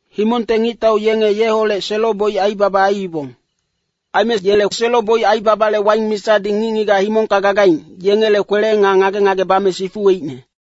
Himongte ngictau yenge yeholec selo-boic aibaba aiibong. Aime yele selo-boic aibabale waing misadi ngic-ngigac himongka gagaing, yengele kwele nga ngage-ngage bame sifuweicne.”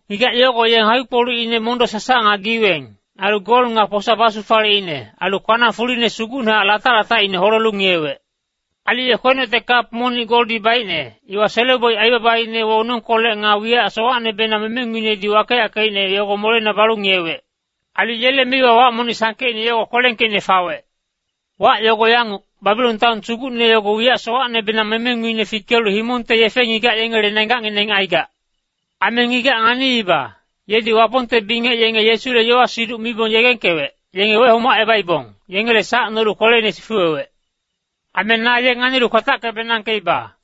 Ngigac yogo ye ngakpi-kpolucine mondo-sasac nga giweng, ailu gol nga posa basufaleicne, ailu kwanang fuline sugucnehac latac-latacine holelu ngiyewec. Ailu ye kwenocte kap monic goldi baicne, iwa selo-boic aibabaine wonongkolec nga wiyac sowacnebenang memenguinedi wakeyackeicne yogo moleina balu ngiyewec. Ailu yele meiwa wac monic sangkeicne yogo kwelengkeicne fawec. Wac yogo yanguc, Babilon taon sugucne yogo wiyac sowacnebenang memenguinedi fikelu himongte yefe-ngigac yengele nenggacngineng aigac. Aime ngigac nganiiba, yedi Wapongte bingec yenge Yesule yowa-siduc mibong yegengkewec, yenge wehomacebaibong, yengele sac nolu kweleine sifuwewec. Aime na ye nganilu kwatatacke-benangkeiba.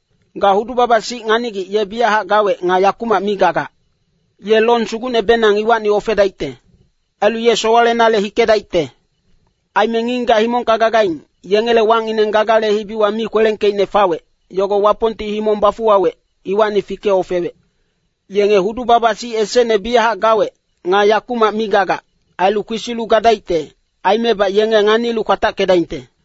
Ga hudu-baba-sic nganigic ye biyachac gawec nga yakumac mi gagac. Ye long sugucnebenang iwacni ofedaicte. Ailu ye sowalenale hikedaicte. Aime ngic-ngigac himongka gagaing, yengele wacngineng Gagale hibiwa mi kwelengkeicne fawec, yogo Wapongti himong bafuwawec, iwacni fike-ofewec. Yenge hudu-baba-sic esecne biyachac gawec, nga yakumac mi gagac, ailu kwesilu gadaicte, aimebac yenge nganilu kwatackedaingte.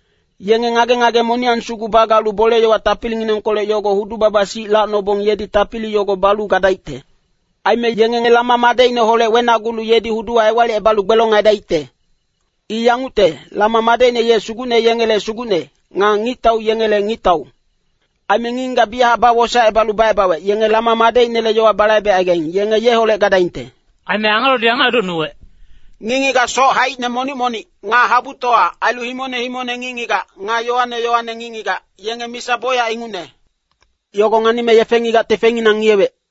Yenge ngage-ngage moniyang sugu bagalu bole-yowa tapilinginengkolec yogo hudu-baba-sic lacnobong yedi tapili yogo balu gadaicte. Aime yenge Lama madecineholec wenagulu yedi huduwa ewalicebalu gbelong aidaicte. I yangucte, Lama madecine ye sugucne yengele Sugucne, nga ngictau yengele Ngictau. Aime ngic-ngigac biyachac bawosaecebalu wacebawec, yenge Lama madecinele yowa balaibecaigaing, yenge yeholec gadaingte.” Aime angelodi yanguc edocnuwec, “Ngic-ngigac soc haicine monic-monic, nga habutowa, ailu himongne himongne ngic-ngigac, nga yowane yowane ngic-ngigac, yenge misa bocyac ingucne. Yogo nganime yefe-ngigacti yengele feinginang ngiyewec.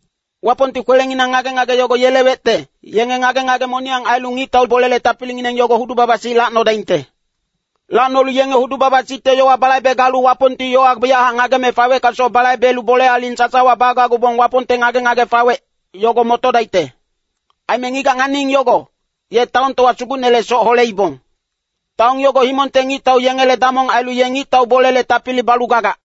Wapongti kwelenginang ngage-ngage yogo yelewecte, yenge ngage-ngage moniyang ailu ngictau bolele tapilingineng yogo hudu-baba-sic lacnodaingte. Lacnolu yenge hudu-baba-sicte yowa balaibe galu Wapongti yowa biyachac ngageme faweckasoc balaibelu bole aling sasawa bagacgubong Wapongte ngage-ngage fawec, yogo motodaicte. Aime ngigac nganiing yogo, ye taontowa sugucnele soc holeibong. Taon yogo himongte ngictau yengele damong ailu ye ngictau bolele tapili balu gagac.”